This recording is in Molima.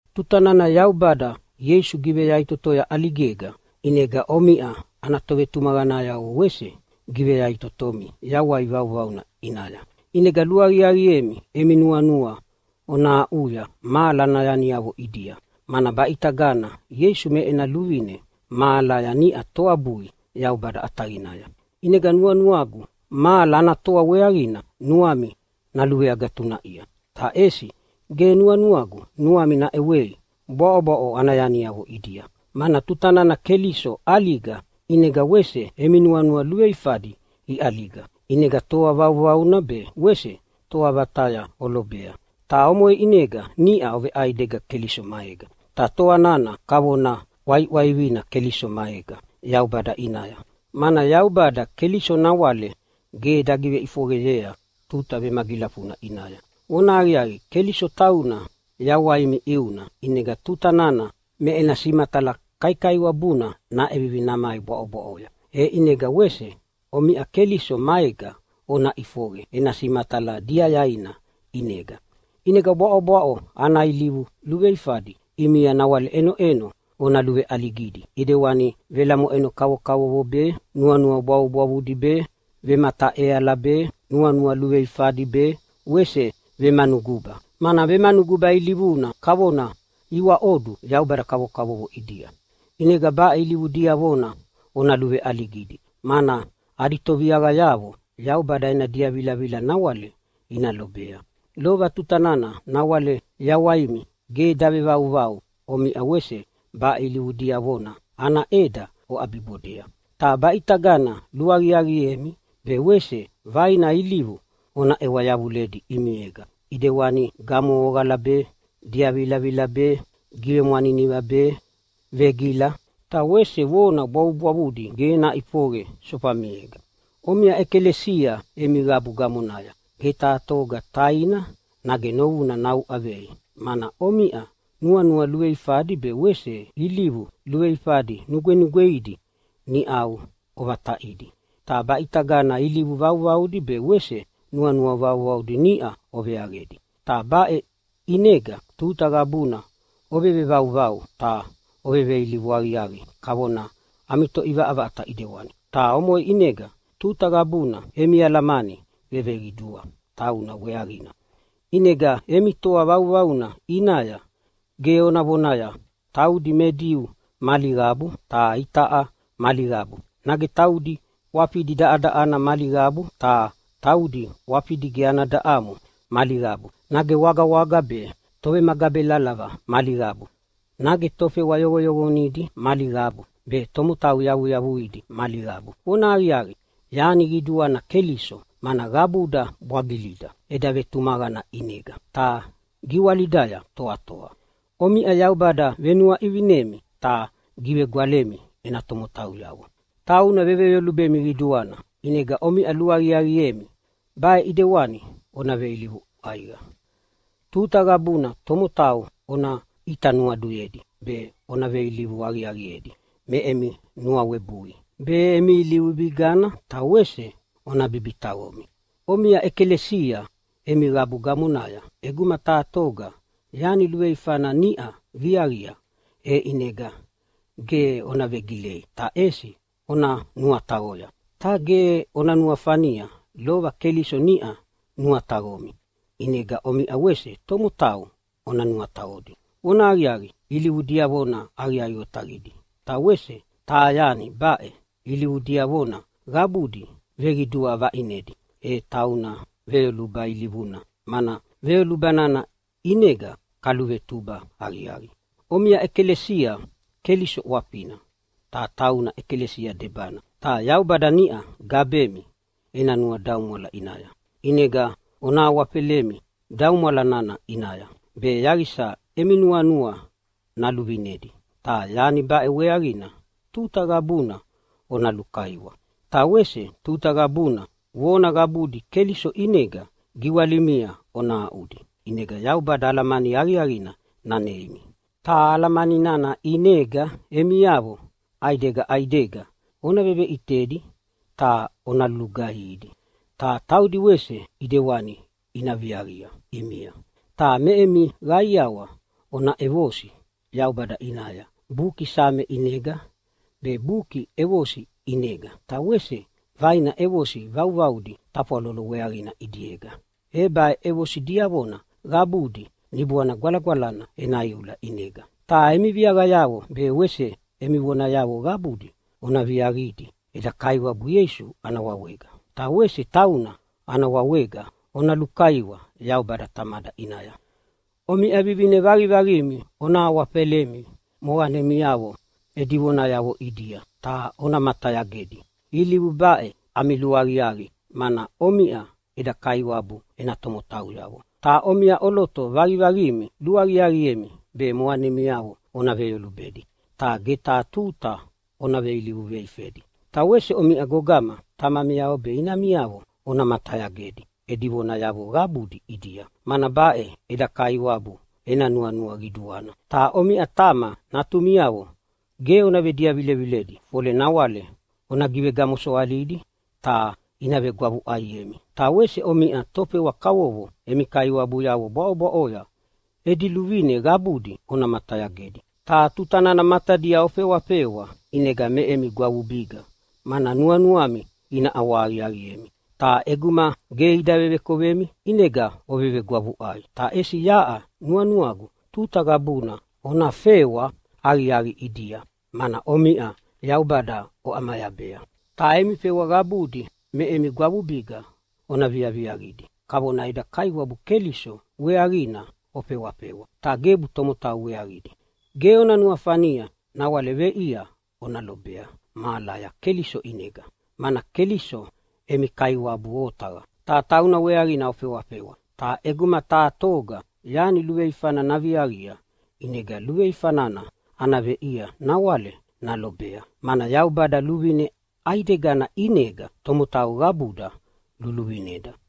Tuta nana Yaubada Ieisu giveyaʼitotoya ʼaligega, ʼinega omiʼa ana tovetumaqanayavo wese giveyaʼitotomi yawai vauvauna ʼinaya. ʼInega luaqiaqiemi emi nuanua ona aʼuya mahala ana yaniavo ʼidia, mana baʼitagana Ieisu me ena luvine mahalaya niʼa toabui Yaubada ʼataqinaya. ʼInega nuanuagu mahala ana toa weaqina nuami naluveagatunaʼia. Ta ʼesi ge nuanuagu nuami naʼewei bwaʼobwaʼo ana yaniavo ʼidia. Mana tuta nana Keliso ʼaliga ʼinega wese emi nuanua luveifadi iʼaliga, ʼinega toa vauvauna be wese toa vataya olobea, ta omoʼe ʼinega niʼa oveʼaidega Keliso maega. Ta toa nana kavona ʼwaiʼwaivina Keliso maega Yaubada ʼinaya, mana Yaubada Keliso nawale ge dagiveʼifoqeyea tuta vemagilafuna ʼinaya. Vonahaqiaqi, Keliso tauna yawaimi ʼiuna, ʼinega tuta nana me ena simatala kaikaiwabuna naʼevivi namai bwaʼobwaʼoya, e ʼinega wese omiʼa Keliso maega ona ʼifoqe ena simatala diayaina ʼinega. ʼInega bwaʼobwaʼo ana ilivu luveifadi ʼimia nawale iʼenoʼeno ona luveʼaligidi ʼidewani velamoʼeno kavokavovo be, nuanua bwavubwavudi be, vemataʼeala be, nuanua luveifadi be wese vemanuguba, mana vemanuguba ilivuna kavona iwaʼodu yaubada kavokavovo ʼidia. ʼInega baʼe ilivu diavona ona luveʼaligidi, mana adi toviaqayavo Yaubada ena diavilavila nawale ina lobea. Lova tuta nana nawale yawaimi ge davevauvau omiʼa wese baʼe ilivu diavona ana ʼeda oʼabibodea. Ta baʼitagana luaqiaqiemi be wese vaina ilivu ona ʼewa yavuledi ʼimiega ʼidewani gamohoqala be, diavilavila be, givemwaniniva be, vegila, ta wese vona bwavubwavudi ge naʼifoqe sofamiega. Omiʼa ʼekalesia emi qabu gamonaya ge taha toga taina nage novuna nauʼavei. Mana omiʼa nuanua luveifadi be wese ilivu luveifadi nugwenugweidi niʼau ovataʼidi, ta baʼitaga ilivu vauvaudi be wese nuanua vauvaudi niʼa oveaqedi. Ta baʼe ʼinega tuta qabuna ovevevauvau, ta oveveilivu aqiaqi kavona ami Toʼivaʼavaʼata ʼidewani. Ta omoʼe ʼinega tuta qabuna emi alamani veveqidua tauna weaqina. ʼInega emi toa vauvauna ʼinaya ge ona vonaya, “Taudi me Diu mali qabu, ta itaʼa mali qabu”, nage “Taudi ʼwafidi daʼadaʼana mali qabu, ta taudi ʼwafidi ge ana daʼamo mali qabu”, nage “Wagawaga be tovemagabelalava mali qabu”, nage “Tofewa yoqoyoqonidi mali qabu be tomotau yavuyavuidi mali qabu.” Vonahaqiaqi, yani qiduana Keliso, mana qabuda bwagilida eda vetumaqana ʼinega ta giwalidaya toatoa. Omiʼa Yaubada venuaʼivinimi ta givegwalemi ena tomotauyavo. Tauna veveyolubemi qiduana. ʼInega omiʼa luaqiaqiemi baʼe ʼidewani ona veilivu ʼaiqa. Tuta qabuna tomotau ona ʼita nuaduyedi be, ona veilivu aqiaqiedi me emi nuawebui be, emi ilivu bigana ta wese ona bibitaqomi. Omiʼa ʼekalesia emi qabu gamonaya ʼeguma taha toga yani luveifana niʼa viaqia, e ʼinega ge ona vegilei ta ʼesi ona nuataqoya. Ta ge ona nuafania lova Keliso niʼa nuataqomi, ʼinega omiʼa wese tomotau ona nuataqodi. Vonahaqiaqi, ilivu diavona aqiaqi otaqidi. Ta wese taha yani baʼe ilivu diavona qabudi veqidua vaʼinedi, e tauna veyoluba ilivuna, mana veyoluba nana ʼinega kaluvetuba aqiaqi. Omiʼa ʼekalesia Keliso ʼwafina, ta tauna ʼekalesia debana. Ta Yaubada niʼa gabemi ena nuadaumwala ʼinaya. ʼInega ona awafelemi daumwala nana ʼinaya, be yaqisa emi nuanua naluvinedi. Ta yani baʼe weaqina tuta qabuna ona lulukaiwa. Ta wese tuta qabuna vona qabudi Keliso ʼinega giwalimia ona aʼudi, ʼinega Yaubada alamani aqiaqina naneimi. Ta alamani nana ʼinega emiavo ʼaidega ʼaidega ona veveʼitedi ta ona lulugaihidi, ta taudi wese ʼidewani ina viaqia ʼimia. Ta me emi qaiawa ona ʼevosi Yaubada ʼinaya Buki Same ʼinega be, Buki ʼEvosi ʼinega ta wese vaina ʼevosi vauvaudi tafwalolo weaqina ʼidiega. E baʼe ʼevosi diavona qabudi Niboana Gwalagwalana ena iula ʼinega. Ta emi viaqayavo be wese emi vonayavo qabudi ona viaqidi eda Kaiwabu Ieisu ana wawega, ta wese tauna ana wawega ona lukaiwa Yaubada Tamada ʼinaya. Omiʼa vivine vaqivaqimi ona awafelemi moqanemiavo edi vonayavo ʼidia ta ona matayagedi. Ilivu baʼe ami luaqiaqi, mana omiʼa eda Kaiwabu ena tomotauyavo. Ta omiʼa ʼoloto vaqivaqimi luaqiaqiemi be moqanemiavo ona veyolubedi, ta ge taha tuta ona veilivu veifedi. Ta wese omiʼa gogama, tamamiavo be inamiavo ona matayagedi edi vonayavo qabudi ʼidia, mana baʼe eda Kaiwabu ena nuanua qiduana. Ta omiʼa tama, natumiavo ge ona vediavileviledi, fole nawale ona givegamosoalidi ta ina vegwavuʼaiemi. Ta wese omiʼa tofewa kavovo emi kaiwabuyavo bwaʼobwaʼoya edi luvine qabudi ona matayagedi. Ta tuta nana matadia ofewafewa, ʼinega me emi gwavubiga mana nuanuami ina ʼawahaqiaqiemi. Ta ʼeguma ge ida vevekovemi ʼinega ovevegwavuʼai. Ta ʼesi yaʼa nuanuagu tuta qabuna ona fewa aqiaqi ʼidia, mana omiʼa Yaubada oʼamayabea. Ta emi fewa qabudi me emi gwavubiga ona viaviaqidi kavona eda Kaiwabu Keliso weaqina ofewafewa, ta gebu tomotau weaqidi. Ge ona nuafania nawale veʼia ona lobea mahalaya Keliso ʼinega, mana Keliso emi Kaiwabu otaqa, ta tauna weaqina ofewafewa. Ta ʼeguma taha toga yani luveifana naviaqia, ʼinega luveifa nana ana veʼia nawale nalobea, mana Yaubada luvine ʼaidegana ʼinega tomotau qabuda luluvineda.